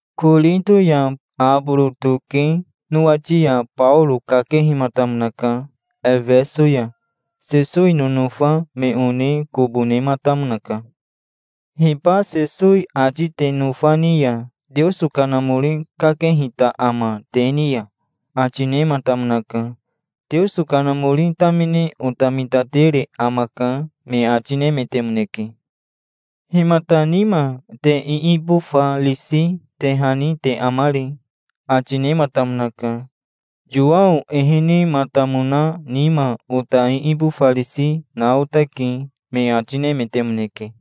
Korito ya Aboro toke nowati ya Baoro kakehimatamonaka Efeso ya. Sesowi nonofa me one kobo nematamonaka. "Hiba Sesowi ati te nofa ni ya Teoso Kanamori kakehita ama te ni ya?" ati nematamonaka. "Teoso Kanamori tamine ota mitatere amaka", me ati nemetemoneke. "Himata nima te iibofarisi tehani te amari?" ati nematamonaka. "Yowao ehenematamona nima ota iibofarisi na otake", me ati nemetemoneke.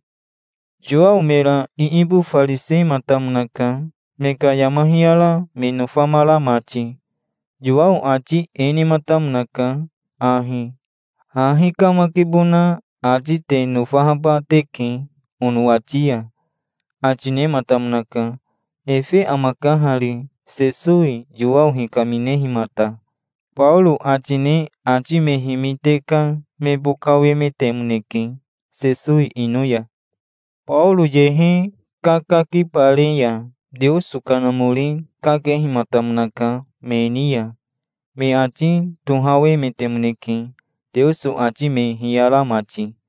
"Yowao mera iibofarisematamonaka, me ka yama hiyara me nofamara mati. Yowao ati e nematamonaka ahi: 'Hahi kamakibona ati te nofahaba teke onowati ya', ati nematamonaka. Efe amaka hari, Sesowi, Yowao hikaminehimata", Baoro ati ne ati me himite ka me bokawemetemoneke Sesowi ino ya. Baoro yehe kakakibare ya Teoso Kanamori kakehimatamonaka me ni ya. Me ati tohawemetemoneke, Teoso ati me hiyara mati,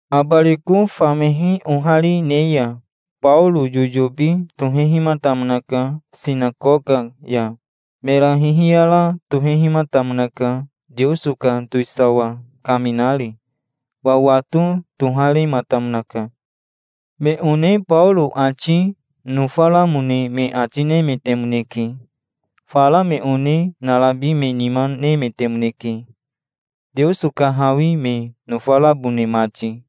Abariko famehi ohari ne ya Baoro yoyobi tohehimatamonaka sinakoka ya. Mera hihiyara tohehimatamonaka, Teoso ka towisawa kaminari. Wawato toharematamonaka. Me one Baoro ati nofaramone me ati nemetemoneke. Fara me one narabi me nima nemetemoneke, Teoso ka hawi me nofarabone mati.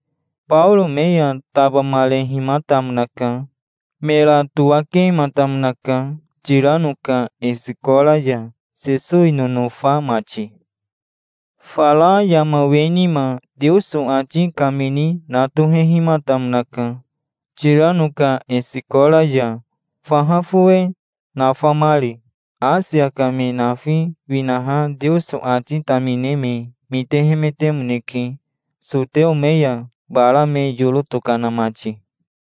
Baoro me ya tabamarehimatamonaka. Mera towakematamonaka Tirano ka esikora ya, Sesowi nonofa mati. Fara yama we nima Teoso ati kamini na tohehimatamonaka Tirano ka esikora ya, faha fowe nafamari. Asia ka me nafi winaha Teoso ati tamine me mitehemetemoneke, soteo me ya bara me yoro tokana mati.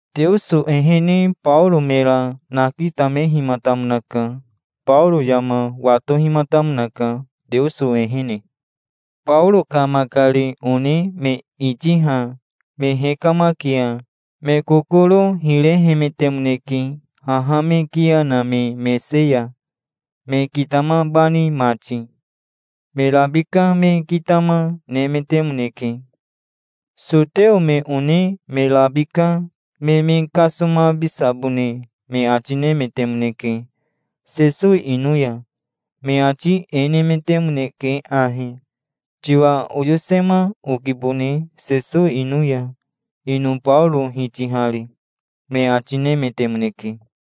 Teoso ehene Baoro mera nakitamehimatamonaka. Baoro yama watohimatamonaka Teoso ehene. Baoro ka makari one me itiha me hekamakia me kokoro hirehemetemoneke haha me kiya na me mese ya, me kitamabani mati. Me rabika me kitama, nemetemoneke. Soteo me one me rabika me me kasomabisabone me ati nemetemoneke, Sesowi ino ya. Me ati e nemetemoneke ahi: "Tiwa oyosema okibone Sesowi ino ya, ino Baoro hitihari", me ati nemetemoneke.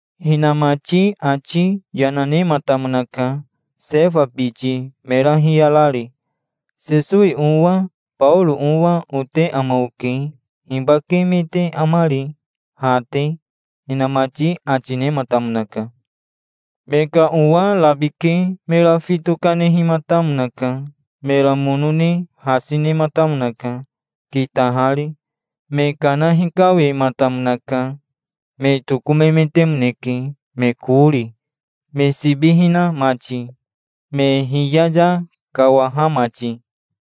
Hinamati ati yana nematamonaka, Sefa biti mera hiyarari. "Sesowi owa, Baoro owa, ote ama oke. Hibake me te amari, ha te?" hinamati ati nematamonaka. Me ka owa rabike mera fito kanehimatamonaka. Mera mono ne hasi nematamonaka, kitahari. Me kana hikawematamonaka. Me tokomemetemoneke, me kori, me sibi hina mati, me hiyaya kawaha mati.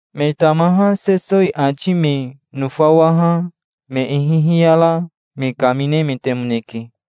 Me tamaha Sesowi ati me nofawaha me ihi hiyara me kaminemetemoneke.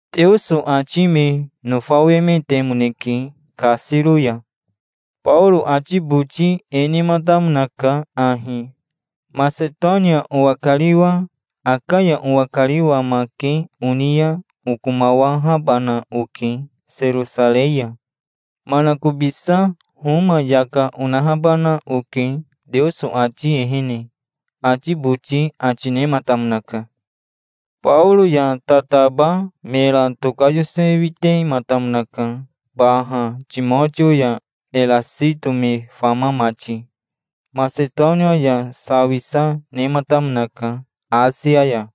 Teoso ati me nofawemetemoneke kasiro ya. Baoro ati boti e nematamonaka ahi: "Masetonia owakariwa Akaya owakariwamake oni ya okomawahabana oke Serosarei ya. Manakobisa Homa yaka onahabana oke Teoso ati ehene", ati boti ati nematamonaka. Baoro ya tataba mera tokayosewitematamonaka baha, Timotio ya Erasito me fama mati, Masetonia ya. Sawisa nematamonaka Asia ya.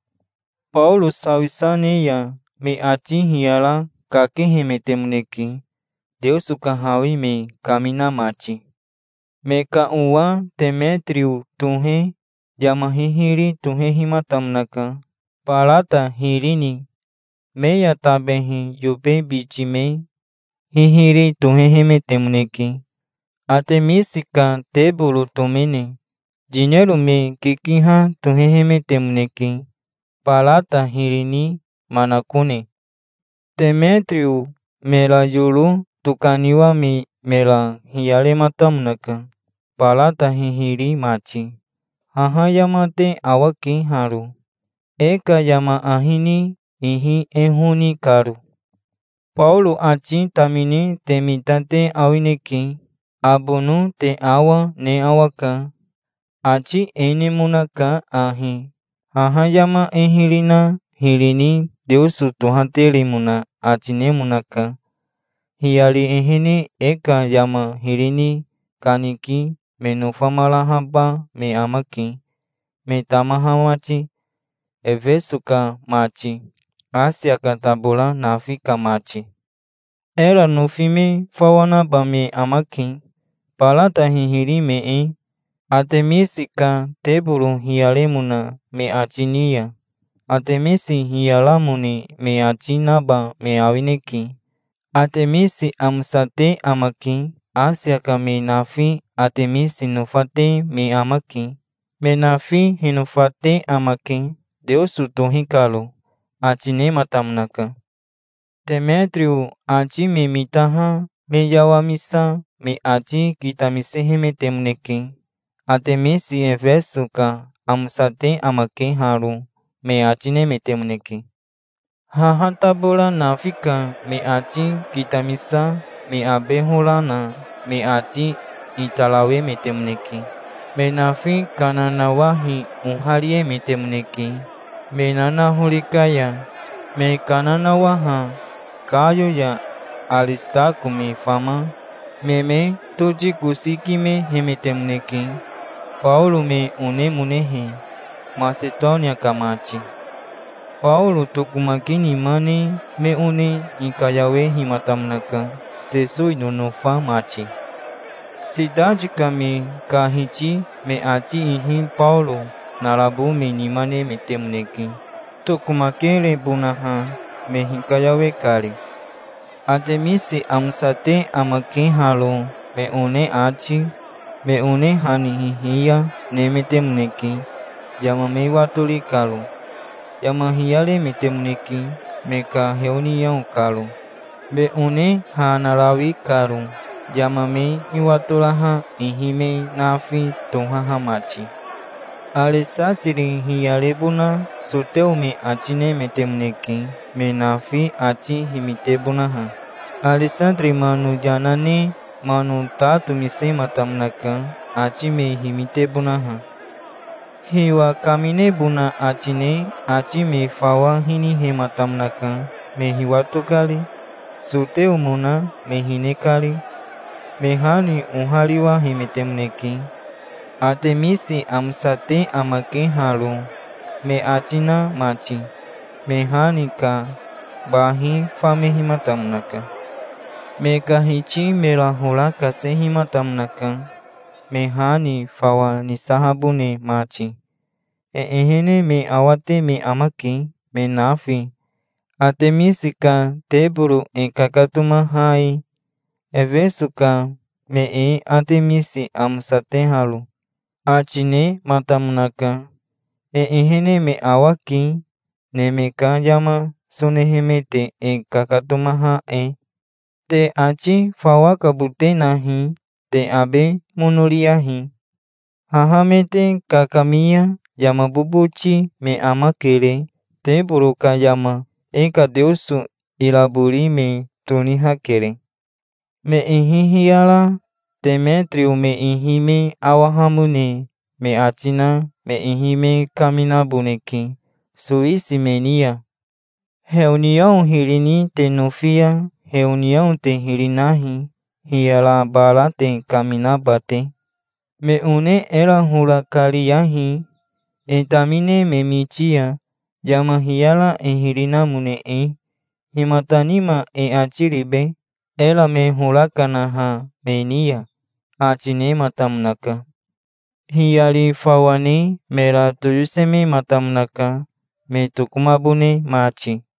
Baoro sawisa ne ya me ati hiyara kakehemetemoneke, Teoso ka hawi me kamina mati. Me ka owa Temetirio tohe yama hihiri tohehimatamonaka, barata hiri ni. Me ya tabehi yobe biti me hihiri tohehemetemoneke, Atemisi ka teboro tomene. Yinero me kikiha tohehemetemoneke, barata hiri ni manakone. Temetirio mera yoro tokaniwame mera hiyarematamonaka, barata hihiri mati. "Haha yama te awake haro, e ka yama ahi ni, ihi e honi karo. Baoro ati tamine te mita te awineke. Abono te awa, ne awaka. Ati e nemonaka ahi: Haha yama e hiri na hiri ni teoso tohateremona ati nemonaka. Hiyari ehene e ka yama hiri ni kaniki me nofamarahaba me amake, me tamaha mati, Efeso ka mati, Asia ka tabora nafi ka mati. Era nofi me fawa naba me amake, barata hihiri me e, Atemisi ka teboro hiyaremona me ati ni ya. Atemisi hiyaramone me ati naba me awineke. Atemisi amosate amake. Asia ka me nafi Atemisi nofate me amake. Me nafi hinofate amake, teoso tohi karo", ati nematamonaka. Temetirio ati me mitaha me yawamisa me ati kitamisehemetemoneke. "Atemisi Efeso ka amosate amake haro", me ati nemetemoneke. Haha tabora nafi ka me ati kitamisa me abe hora na me ati itarawemetemoneke. Me nafi kana nawahi ohariemetemoneke, me nanahori ka ya. Me kana nawaha Kayo ya Arisitako me fama me me totikosikimehemetemoneke, Baoro me onemonehe, Masetonia ka mati. Baoro tokomakinima ne me one hikayawehimatamonaka, Sesowi nonofa mati. Sitati ka me ka hiti me ati ihi Baoro narabo me nima nemetemoneke, tokomakerebonaha, me hikayawe kari. "Atemisi amosate amake haro", me one ati, me one ha ni hihiya nemetemoneke, yama me watori karo. Yama hiyaremetemoneke, me ka heoniao karo, me one ha narawi karo, yama me hiwatoraha ihi me nafi tohaha mati. Aresatiri hiyarebona soteo me ati nemetemoneke, me nafi ati himitebonaha. Aresatiri mano yana ne mano ta tomisematamonaka, ati me himitebonaha. Hiwa kaminebona ati ne ati me fawa hinihematamonaka, me hiwato kari, soteomona me hine kari. Me ha ni ohariwahemetemoneke, "Atemisi amosate amake haro", me ati na mati. Me ha ni ka bahi famehimatamonaka. Me ka hiti mera hora kasehimatamonaka, me ha ni fawa nisahabone mati. "E ehene me awate me amake, me nafi, Atemisi ka teboro e kakatomaha e, Efeso ka me e, Atemisi amosateharo", ati nematamonaka. "E ehene me awake, neme ka yama sonehemete e kakatomaha e. Te ati fawa kabote nahi. Te abe mono riyahi. Haha me te kakamiya yama boboti me amakere, teboro ka yama. E ka teoso irabori me tonihakere. Me ihi hiyara Temetirio me ihi me awahamone me ati na me ihi me kaminaboneke sowisi me ni ya. Heoniao hiri ni te nofi ya heoniao te hiri nahi, hiyara bara te kaminaba te. Me one era hora kariyahi, e tamine me miti ya, yama hiyara e hiri namone e. Himata nima e ati ribe, era me hora kanaha me ni ya?" ati nematamonaka. Hiyari fawa ne mera toyosemematamonaka, me tokomabone mati.